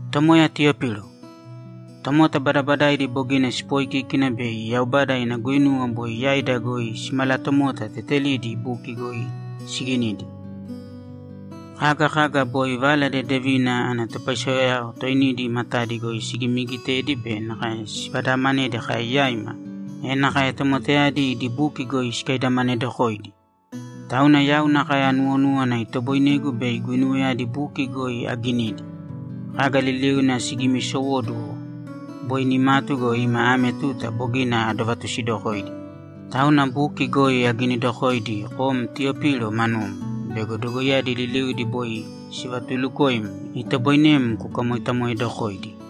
Tomoya Tiyopilo, Tomota badabadaidi bogina sipoikíkina bei Yaubada ina guinuwa boi yaida goi simalatomota tetelidi buki goi siginidi. Kaga kaga boi Vala Dedevina ana topaisewao toinidi matadi goi sigimiigitedi be nakae sivadaamanedi kai yaima, e nakae tomotayadi idi buki goi sikaidamanedokoidi. Tauna yau nakae anuwonúwana itoboinegu bei guinuwayadi buki goi aginidi. Kaga liliuna sigimiisowóduwo boi nimatu go, ima ame tuta bogina adovatusidokoidi, tauna buki goi aginidokoidi kom Tiyopilo manum bego dogoiyadi liliudi boi sivatuulukoim, itoboinem kukamoitamoedokoidi.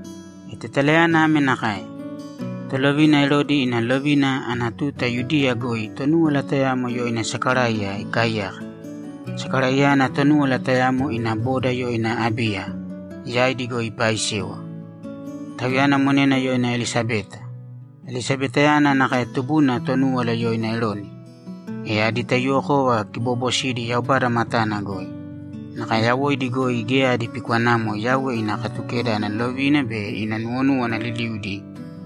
E tetalayana ame nakae: Tolovina Erodi ina lovina ana tuta Yudiya goi Tonúwala tayamo yoina Sakaraiya ikaaiyaka. Sakaraiyayana Tonúwala tayamo ina boda yoina Abiya yaidi goi ipaaisewa. Tauyana monena yoina Elisabeta. Elisabetayana nakae tubuna Tonúwala yoina Eroni. E adi taiyuwokova kiboobosidi Yaubada matana goi. Nakae yawoidi goi geya adi pikwanamo Yauwe ina Katukeda ana lovina be ina nuwonúwana liliudi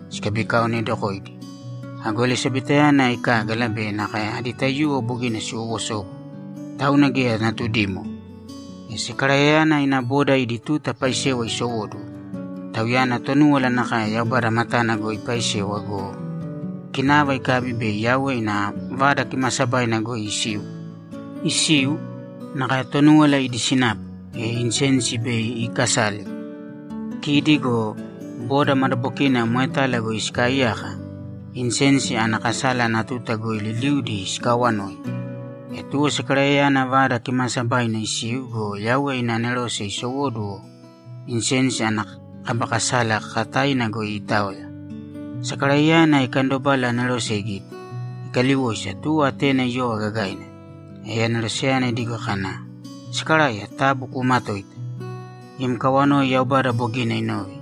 sikabikaonedokoidi. Ago Elisabetayana ikágala be nakae adi taiyuwo bogina siwowosobu, tauna geya natudimo. E Sakaraiyayana ina bodao idi tuta paisewa isowóduwo, tauyana Tonúwala nakae Yaubada matana goi ipaaisewa go, kinava ikabi bei Yauwe ina Vada Kimaasabaina goi isiu. Isiu, nakae Tonúwala idi sinapu, e insensi bei iikasale. Kidi go boda madabokina moetala goi sikaaiyaka, insensi ana kasala ana tuta goi liliudi sikaawanoi. E tuwo Sakaraiyayana Vada Kimaasabaina isiu go, Yauwe ina anerose isowóduwo insensi ana kaba kasala kakataina goi iitaoya. Sakaraiyayana ikandobala anerose igite, ikaliwoisa, tuwo atena iyova gagaina. E aneroseyana idigo kana, ‘Sakaraiya, taabu kuumatōita. Im kawanoi Yaubada bogina inove,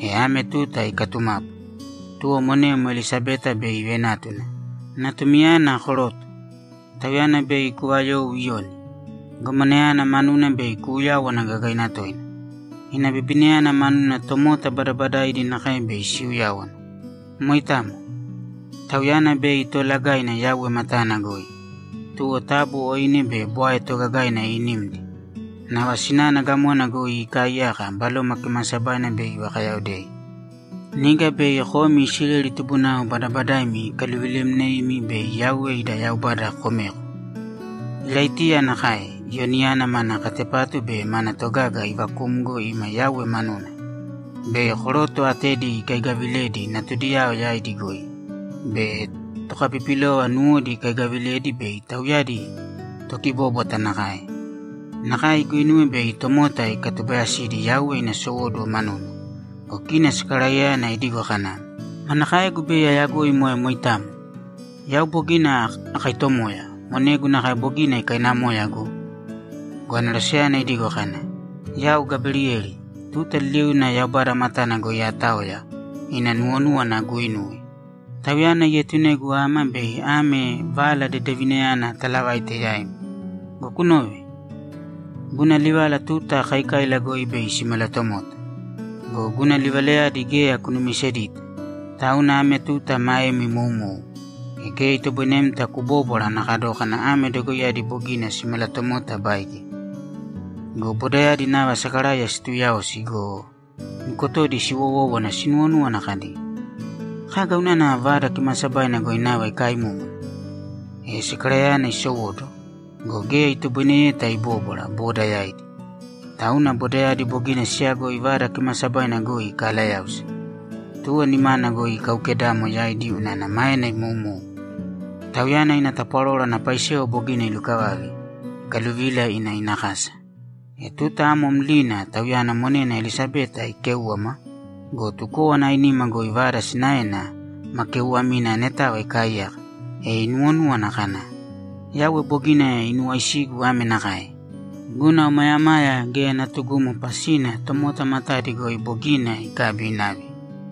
e ame tuta ikatumapu. Monem Elisabeta bei ivenátuna, natumiyana koroto. Tauyana bei kuvayou Iyoni. Gomanayana manuna bei kuuyáwana gagaina toina. Ina bibinayana manuna tomota badabadaidi nakae bei siuyáwana. Moitamo. Tauyana bei toolagaina Yauwe matana goi. Taabu oine be bwae toogagaina iinīmdi. Nava sinana gamona goi ikaaiyaka Baloma Kimaasabaina bei ivakayaodei. Niga bei komi Isileli tubunao badabadaimi ikaluvilemneimi, e Yauwe ida Yaubada komeko. Iraitiya nakae Iyoniyana mana katepatu be mana togaga ivakumgo ima Yauwe manuna. Koroto atedi bei ikayagaviledi natudiyao yaidi goi, tokapipilova nuwodi ikayagaviledi bei tauyadi tokibóbwata nakae, be tomota ikatubayasidi Yauwe ina sowóduwo manuna.’ Go kina Sakaraiyayana idigo kana, ‘Kaga goi bei ayagoi moe moitamo? Yau bogina akaitomoya. Monegu nakae bogina ikainamoya go!’ Go aneroseyana idigo kana, ‘Yau Gaberiyeli, tuta liliuna Yaubada matana goi aataoya ina nuwonúwana aguuinuwe. Tauyana ietunegu ama bei ame vala dedevinayana atalavaite yaim. Go kunōve. Guna livala tuta kaikaila goi bei simalatomota. Go guna livalayadi geya kunumisedita, tauna ame tuta maem imoumou, e geya itoboinemta kubóbwara ana kadókana ame dogoiyadi bogina simalatomota baige.’ Go bodayadi nava Sakaraiya situuyaosi go, nukotodi siwowówana sinuwonúwana kadi, ‘Kaga unana Vada Kimaasabaina goi nava ikaaimúmuna?’ E Sakaraiyayana isowóduwo go, geya itoboineyeta ibóbwara boda yaidi. Tauna bodayadi bogina siyagoi Vada Kimaasabaina goi ikaalayáusa. Tuwo nimana goi ikaaukedamo yaidi unana maena imoumou. Tauyana ina tapwaroro ana paisewa bogina ilukavave, ikaluvila ina ina kasa. E tuta amo mlina tauyana monena Elisabeta ikéuwama go, tukówana ainima goi vada sinaena ma keeuwamina anetava ikaaiyaka, e inuwonúwana kana, ‘Yauwe bogina inuwaisigu ame nakae: Guna omayamaya geya natugumo pasina tomota matadi goi bogina ikabi inave.’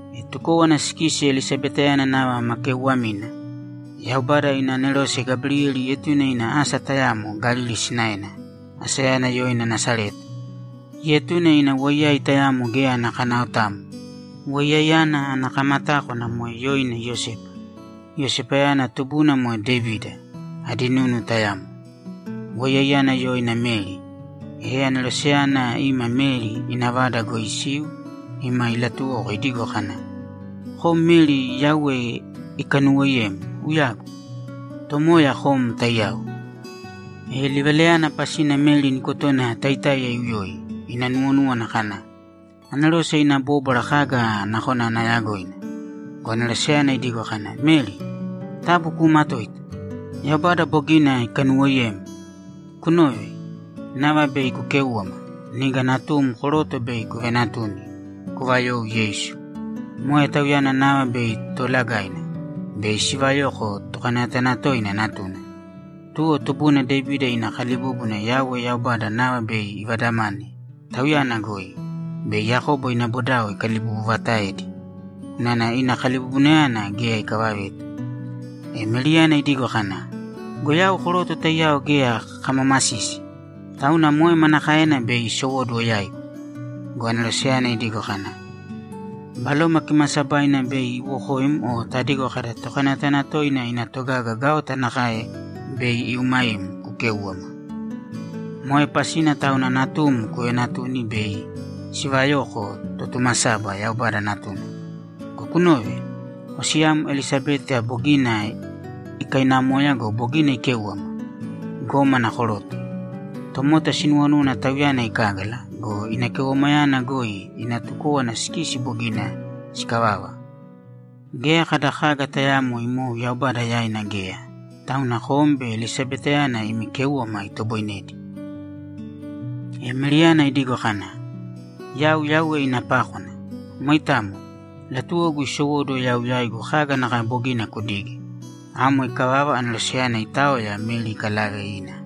E tukówana sikisi Elisabetayana nava ma keeuwamina, Yaubada ina anerose Gaberiyeli ietune ina asa tayamo Galili sinaena, asayana yoina Nasareta. Ietune ina woiyai tayamo geya ana kanaotamo. Woiyaiyana ana kamatákwana moe yoina Iyosepa. Iyosepayana tubuna moe Devida, adi nunu tayamo. Woiyaiyana yoina Meri. E aneroseyana ima Meri ina vada goi isiu ima ilatuwoko idigo kana, ‘Kom Meri Yauwe ikanuuwoiyem, uyagu! Tomoya kom taiyao!’ E livalayana pasina Meri nukotona taitáiya iuyoi, ina nuwonúwana kana, ‘Anerose ina bóbwara kaga nakona ana yagoina?’ Go aneroseyana idigo kana, ‘Meri, taabu kuumatōita! Yaubada bogina ikanuwoiyem. Kunōve. Nava bei kukéuwama. Niga natum koroto bei kuvenatuni, kuvayou Yeisu. Moe Tauyana nava bei toolagaina, bei sivayoko Tokanayatanatoina Natuna. Tuwo tubuna Devida ina kalibúbuna Yauwe Yaubada nava bei ivadamane Tauyana goi be Yakobo ina bodao ikalibubuvataedi unana ina kalibubunayana geya ikavaveta.’ E Meriyana idigo kana, ‘Yau koroto taiyao geya kamamasisi, tauna moe manakaena bei isowóduwo yaigu?’ Go aneroseyana idigo kana, ‘Baloma Kimaasabaina bei iwokoim o tadigo kada “Tokanayatanatoina ina togaga gaota nakae bei iumaim kukéuwama.” Moe pasina tauna natum kuveenatuni bei sivayoko Totumasaba, Yaubada Natuna. Go kunōve. Osiyam Elisabeta bogina ikainamoya go, bogina ikéuwama, gómana koroto. Tomota sinuwonúwana tauyana ikágala go, ina keuwamayana goi ina tukówana sikisi bogina sikavava. Geya kada kaga tayaamo imou Yaubada yaina geya, tauna kom be Elisabetayana imi kéuwama itoboinedi.’ E Meriyana idigo kana, ‘Yau Yauwe ina pákwana. Moitamo, latuwogu isowóduwo yau yaigu kaga nakae bogina kudige.’ Amo ikavava, aneroseyana itaoya, Meri ikalave ina.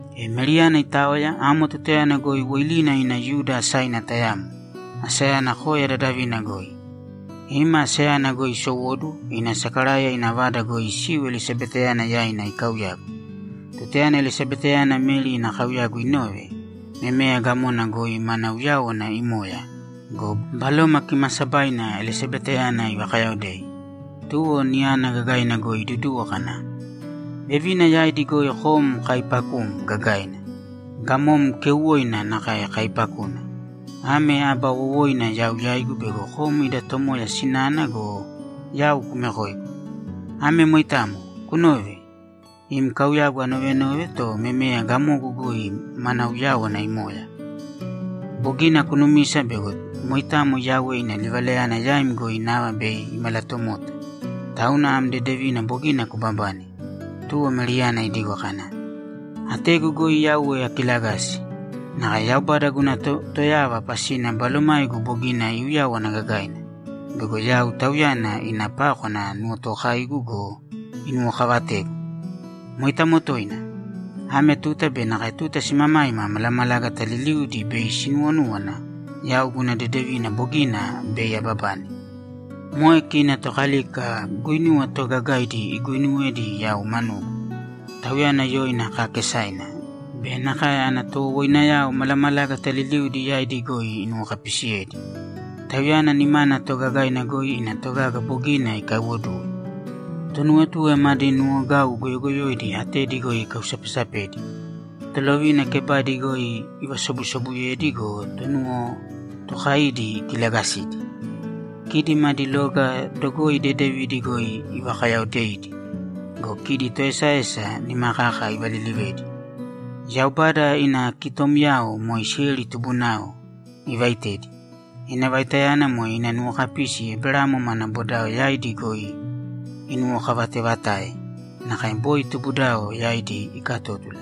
E Meriyana itaoya, amo tutayana goi woilina ina Yuda asaina tayamo, asayana koya dadavina goi. Ima asayana goi isowóduwo ina Sakaraiya ina vada goi isiu Elisabeta yaina ikauyagu. Tutayana Elisabetayana Meri ina kauyagu inove, memeya gamona goi mana uyáwana imoya go, Baloma Kimaasabaina Elisabeta ivakayaodei. Tuwo niyana gagaina goi iduduwo kana, ‘Vevina yaidi goi kom kaaipakum gagaina. Gamom keuwoina nakae kaaipakuna. Ame aba wowoina yau yaigu bego kom ida Tomoya sinana go, yau kumekoigu. Ame moitamo. Kunōve. Im kauyagu anovenove, to memeya gamogu goi mana uyáwana imoya. Bogina kunumisa bego moitamo Yauwe ina livalayana yaim goi nava bei imalatomota, tauna am dedevina bogina kubabane.’ Tuwo Meriyana idigo kana, ‘Ategu goi Yauwe akilagasi. Nakae Yaubada guna Toyava pasina balomaigu bogina iuyáwana gagaina bego yau Tauyana ina pákwana nuwotookaigu go, inuwokavategu. Moitamo toina. Ame tuta be nakae tuta simamaima malamalágata liliudi bei sinuwonúwana yau guna dedevina bogina bei ababane. Moe kina Tokalika guinuwa toogagaidi iguinuwedi yau manugu, Tauyana yoina kaakesaina be nakae ana towowoinayao malamalágata liliudi yaidi goi inuwokapisiyedi. Tauyana nimana toogagaina goi ina togaga bogina ikaiwoduwe. Tonuwatue madi nuwogau goyogoyoidi atedi goi ikausapesapedi. Tolovina kebadi goi ivasobusobuyedi go, tonuwotookaidi ikilagasidi. Kidi madi loga dogoi dedevidi goi ivakayaodeidi go, kidi toesaesa, nima kaka ivalilivedi. Yaubada ina kitomyao, moe Isileli tubunao, ivaitedi. Ina vaitayana moe ina nuwokapisi Eberamo mana bodao yaidi goi inuwokavatevatae nakae boi tubudao yaidi ikatótula.’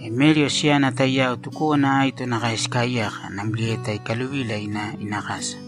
E Meri osiyana taiyao tukówana aito nakae sikaaiyaka namlieta ikaluvila ina ina kasa.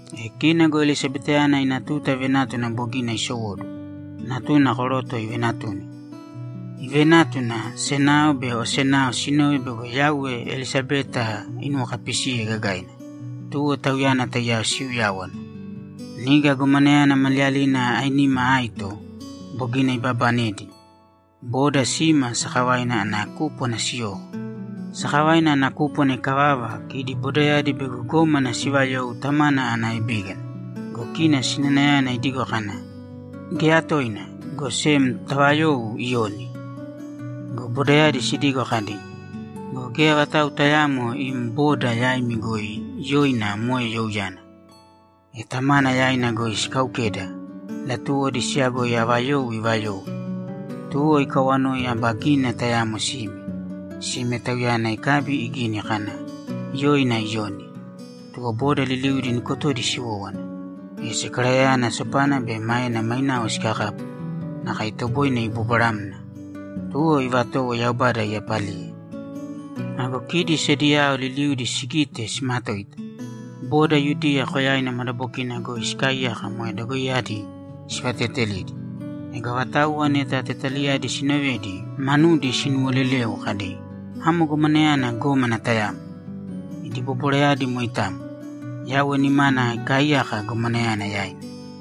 E kina go Elisabetayana ina tuta venátuna bogina isowóduwo, natuna koroto ivenatuni. Ivenátuna, senao be osenao sinove bego Yauwe Elisabeta inuwokapisiye gagaina, tuwo tauyana taiyao siuyáwana. Niga gomanayana maliyalina ainima aito bogina ibabanedi, boda sima sakavaina ana kúpwana siyoko. Sakavaina ana kúpwana ikavava, kidi bodayadi bego gómana sivayou tamana ana ebígana go, kina sinanayana idigo kana, ‘Geya toina, go sem tavayōu Iyoni.’ Go bodayadi sidigo kadi, ‘Go geya vatau tayaamo im boda yaimi goi yoina moe youyana.’ E tamana yaina goi sikaukeda, latuwodi siyagoi ava you ivayou. Tuwo ikawanoi aba gínina tayamo sime. Sime, tauyana ikabi igini kana, ‘Yoina Iyoni.’ Tuwo boda liliudi nukotodi siwówana. E Sakaraiyayana sopana be maena mainao sikakapu, nakae itoboine ibobwaramna. Tuwo ivatowo Yaubada iyapaliye. Ago kidi sediyao liliudi sigite, simatoita. Boda Yudiya koyaina madabokina goi sikaaiyaka moe dogoiyadi sivateetelidi. Ego avatauwa neta tetalayadi siinovedi, manudi sinuwoleleu kadi, ‘Amo gomanayana, gómana tayamo.’ Idi bobwarayadi moitamo. Yauwe nimana ikaaiyaka gomanayana yaina.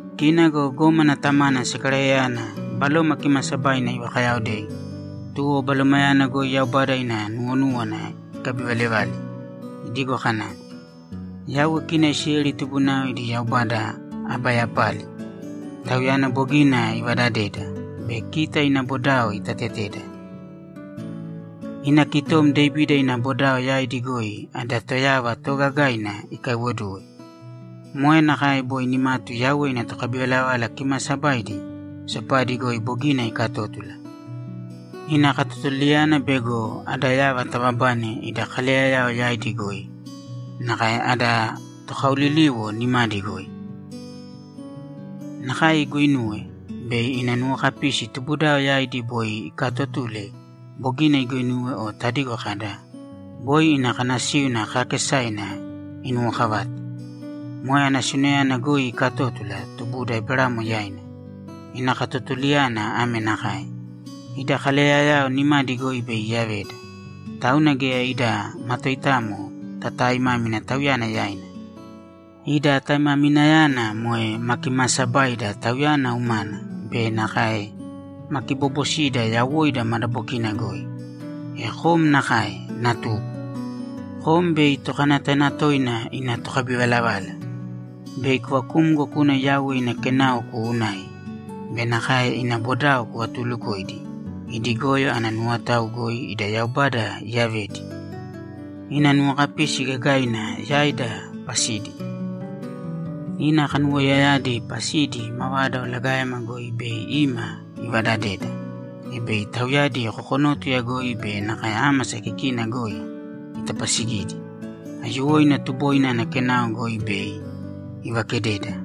Kina go gómana tamana Sakaraiyayana, Baloma Kimaasabaina ivakayaodei, tuwo Balomayana goi Yaubada ina nuwonúwana ikabivalevale, idigo kana, ‘Yauwe kita Isileli tubunao ida Yaubada aba yapali! Tauyana bogina ivadadeda be kita ina bodao itateteda. Ina kitom Devida ina bodao yaidi goi ada Toyava toogagaina ikaiwoduwe. Moe nakae boi nimatu Yauwe ina tokabivalavala kimaasabaidi sopadi goi bogina ikatótula. Ina katotulayana bego ada yava tababane ida kaleyayao yaidi goi nakae ada tokaoliliwo nimadi goi. Nakae iguinuwe bei ina nuwokapisi tubudao yaidi boi ikaatotule bogina iguinuwe o tadigo kada, “Boi ina kanasíuna kaakesaina inuwokavate.” Moe anasiunayana goi ikatótula tubuda Eberamo yaina. Ina katotulayana ame nakae: Ida kaleyayao nimadi goi bei iyaveda, tauna geya ida matoitamo tataaimámina Tauyana yaina. Ida taimaminayana moe ma kimaasabaida Tauyana umana be nakae ma kiboobosida yawoida madabokina goi. E kom nakae, natugu. Kom bei Tokanayatanatoina ina tokabivalavala. Bei kuvakumgo kuna Yauwe ina kenao kuunai be nakae ina bodao kuvatulukoidi idi goyo ana nuwotao goi ida Yaubada iyavedi ina nuwokapisi gagaina yaida pasidi. Ina kanuwoiyayadi pasidi mavada olagaema goi bei ima ivadadeda, e bei tauyadi kokonótuya goi be nakae ámasa kikina goi itapasigidi. Aiyuwoina tuboina ana kenao goi bei ivakededa.’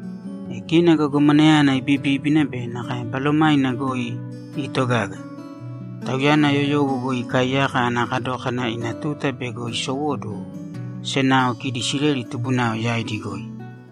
E kina go gomanayana ibibíbina be nakae balomaina goi iitogaga. Tauyana yoyowo goi ikaaiyaka ana kadókana ina tuta bego isowóduwo senao kidi Isileli tubunao yaidi goi.